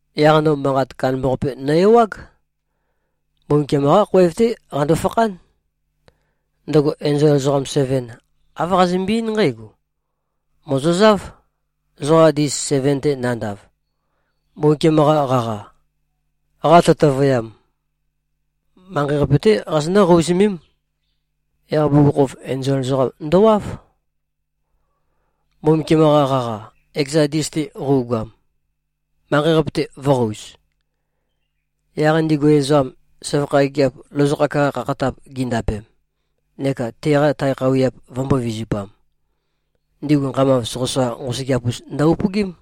Yaq no manqat kandambaqape nø-ewág. Mbumbukiam-qá khoev-té qando-fakhán. Ndøgo enzol ezoqam seven, āv qazømbe-eín nqǽgo, “Mòzozáv. Zoqa ndis seven-te nandav, Mbumbukiam-qa qaqa, qatøtøvøyam, manqei-qape-té qazonǿ-qouzømém.” Yaq bugukhokhof enzol ezoqam ndøwáv, Mbumbukiam-qa qaqa, ekeza ndis-te qøugoam, manqei-qape-te vø̄qouz. Yaq ndigu ezoqam, søvakha gigiap lozokhak-qa khakhatap gindapem neka teqa tae khøuwiap vømbō-vizupam, ndigu nqamav soqøsoqa nqosøgeap-us ndø-upøgím.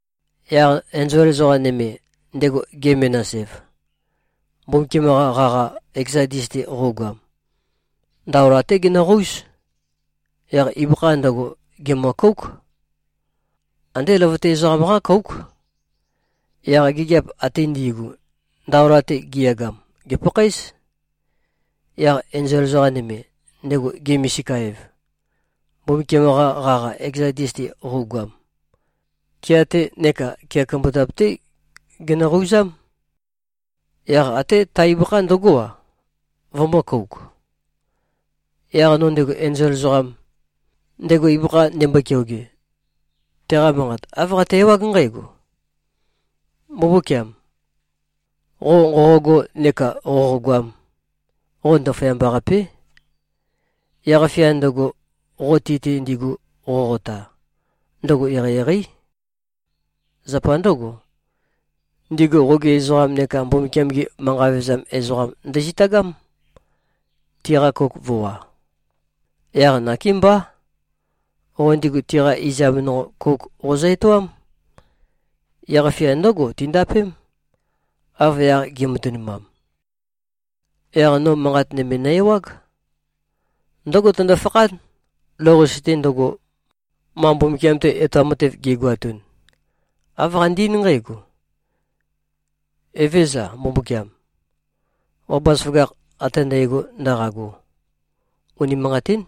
Yaq enzol ezoqa nøme, ndego ge-menas-ev, Mbumbukiam-qa qaqa, ekeza ndis-te qøugoam, ndaola-té genøqóuz. Yaq ibøkha ndøgo, gèmø-kóuk. Andé løvøte ezoqam-qá kóuk. Yaq gigiap ate ndi꞉gu, ndaola-te giyagam, gèpakhaéz. Yaq enzol ezoqa nøme, ndego ge-misika-ev, Mbumbukiam-qa qaqa, ekeza ndis-te qøugoam, kea-te neka kea kumbutap-té genøqouzám. Yaq até ta ibøkha ndøgó-a, vømø̄-kouk. Yaq no ndego enzol ezoqam, ndego ibøkha ndembo-keoge, teqa manqat āv qate-ewág nqǽgo, “Mbumbúkiam! Qo nqoqogo neka qoqogoam, qo ndaføyamba-qapé. Yaq-fia ndøgo, qo ti-te ndigu qoqota, ndøgo eqeieqeí. Zapa ndǿgo, ndigu qogi ezoqam neka Mbumbukiam-gi manqa vevezam ezoqam ndøzitagám, tiqa kouk vø̄wa. Yaq nakémbá, qo ndigu tiqa izam nonqo, kouk qozø-etoám. Yaq-fia ndǿgo tindapém, av yaq gi꞉matønumam.” Yaq no manqat nøme nø-ewág. Ndǿgo tøndo-fakhán, lou-qase-te ndøgo, ma Mbumbukiam-te etoam matev gi꞉goatun. Āv qande-eín nqǽgo, “Evézøza, Mbumbukiam, qo bazaføgakh ate ndægo ndaqago! Unimanqatín.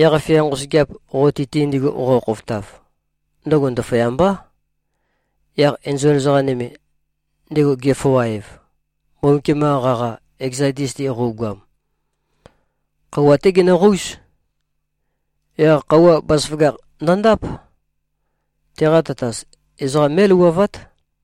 Yaq-fia nqosøgeap, qo ti-te ndigu qoqo-khofotav, ndøgo ndaføyambá.” Yaq enzol ezoqa nøme, ndego ge-foa-ev, Mbumbukiam-qa qaqa, ekeza ndis-te qøugoam, khøuwa-té genøqóuz. Yaq khøuwa, bazaføgakh ndøndáp: Teqa tatas, ezoqa mé꞉louwavát.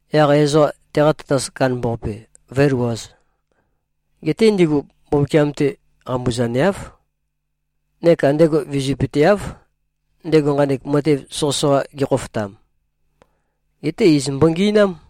Yaq ezoqa teqa tatas kandambaqape, vø̄elouwaz. Geté ndigu Mbumbukiam-te qambuzaneáv, neka ndego vizøpøteáv, ndego nqanek matev soqøsoqa gekhofotam. Geté iz mbongi꞉nám.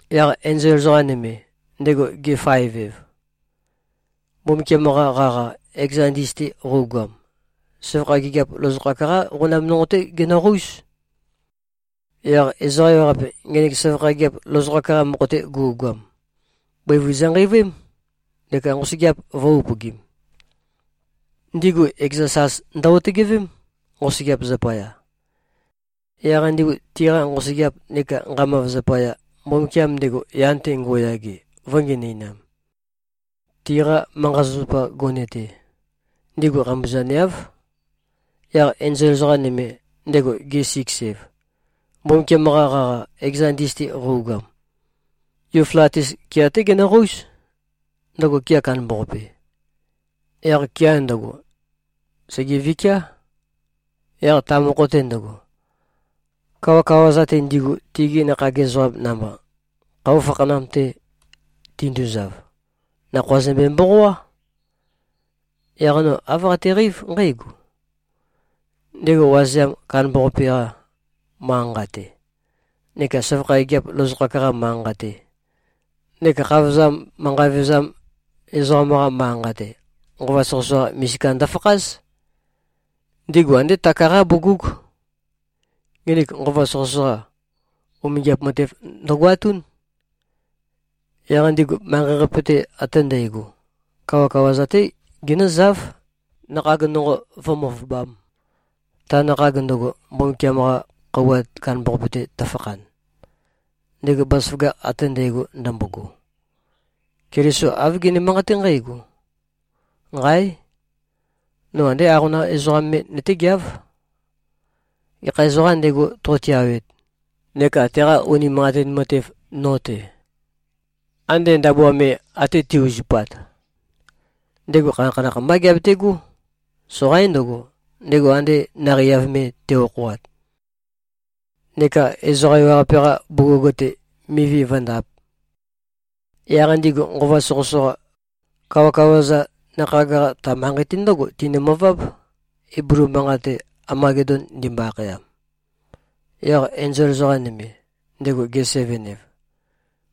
Yaq enzol ezoqa nøme, ndego ge-faev-ev, Mbumbukiam-qa qaqa, ekeza ndis-te qøugoam, søvakha gigiap lozokhak-qá qonam nonqo-té genøqóuz. Yaq ezoqa ewaqape, ngenek søvakha gigiap lozokhak-qa mokho-te gu꞉goam, bøivun zønqeivøém, neka nqosøgeap vø̄-upøgim. Ndigu ekeza sas ndø-otøgevém, nqosøgeap zapaya. Yaq ndigu tiqa nqosøgeap neka nqamav zapaya, Mbumbukiam, ndego yan-te ngo꞉yage, vø̄ngenøinam. Tiqa manqa-zapazapa gone-te, ndigu qambuzaneáv. Yaq enzol ezoqa nøme, ndego ge-siks-ev, Mbumbukiam-qa qaqa, ekeza ndis-te qøugoam, Yuflatis kea-té genøqóuz, ndøgo kea kandambaqape. Yaq kea ndøgo, sègevikiá. Yaq ta mokho-te ndøgo, kawakawa-za-te, ndigu tigi nakhag ezoqam namba, khøuwa fakhanam-te tinduzav, nakhoa zømbe-mboqoá. Yaq no āv qateqeív nqǽgo: Ndego wazeam kandambaqape-qa manqa-nqa-te, neka søvakha gigiap lozokhak-qa manqa-nqa-te, neka khavozam manqa vevezam ezoqam-qa manqa-nqa-te, nqova soqøsoqa misika ndofakház. Ndigu andé taka-qá bugúg. Nginik nqova soqøsoqa, umingiap matev ndøgoatún. Yaq ndigu manqei-qape-te ate ndægo, kawakawa-za-té ginǿzáv, nakhag nonqo vǿ-møvøbām, ta nakhag ndøgo, Mbumbukiam-qa khøuwa kandambaqape-te tøfakhan, ndego bazaføgakh ate ndægo ndømbogo. Keliso āv gene-manqaté nqǽgo, “Nqáe! No andé aqonam ezoqám me nøtégeáv. Gekha ezoqām ndego, to꞉tiawet, neka teqa unimanqatin matev no-te, ande ndabua me ate te꞉-uzupat, ndego khanakhanakh mbá geabetegó. Soqaín ndøgo, ndego ande naqei-av me te꞉-okhoat neka ezoqa ewaqape-qa bugug-te, mivi vǿndāp.” Yaq ndigu nqova soqøsoqa, kawakawa-za, nakhag-qa, ta manqei-te ndǿgo tinømøváb, Iblu manqat-te, Amagedon ndimbo-akhayam. Yaq enzol ezoqa nøme, ndego ge-seven-ev,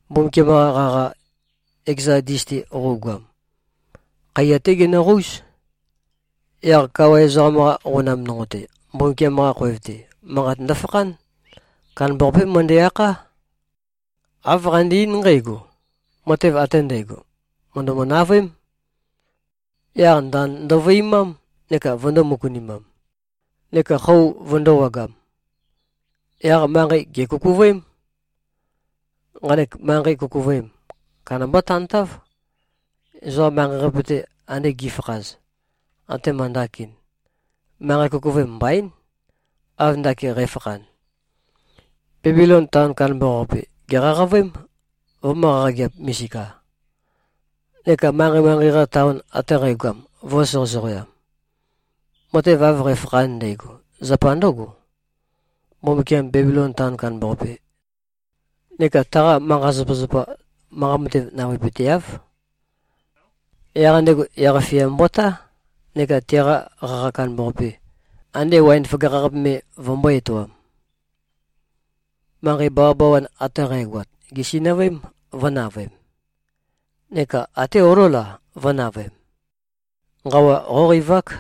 Mbumbukiam-qa qaqa, ekeza ndis-te qøugoam, khaiya-té genøqóuz. Yaq kawa ezoqam-qa qonam nonqo-te, Mbumbukiam-qa khoev-te, manqat ndofakhán. Kandambaqapé møndæ-akhá. Āv qande-eín nqǽgo, “Matev ate ndægo, mø̀ndømø-navøém.” Yaq ndand ndovøimám neka vøndō-møkunimam, neka xo vøndōwagam. Yaq manqei gèkukuvøém. Nqanek manqei kukuvøem, kandambá tantáv. Ezoqa manqei-qape-te ande gi꞉fakhaz, atema ndakin, manqei kukuvøem mbaín, av ndakin qæfakhan. Bebilon taon kandambaqape, gèqaqavøém, vømø̄-qaqageap-misika. Neka manqei-manqei-qa taon ate qægoam, vø̄soqøsoqoam. Matev av qæfakhan ndægo, zapa ndǿgo: Mbumbukiam Bebilon taon kandambaqape neka taqa manqa-zapazapa, manqa mate navøepøteáv. Yaq ndego yaq-fia mbotá, neka teqa qaqa kandambaqape, ande waen føgakh-qape me vømbō-etoam. Manqei bawabawa ate qægoat, gèsinøvøém, vø̄navøem. Neka até olól-a, vø̄navøem. Nqawa qóqeivák.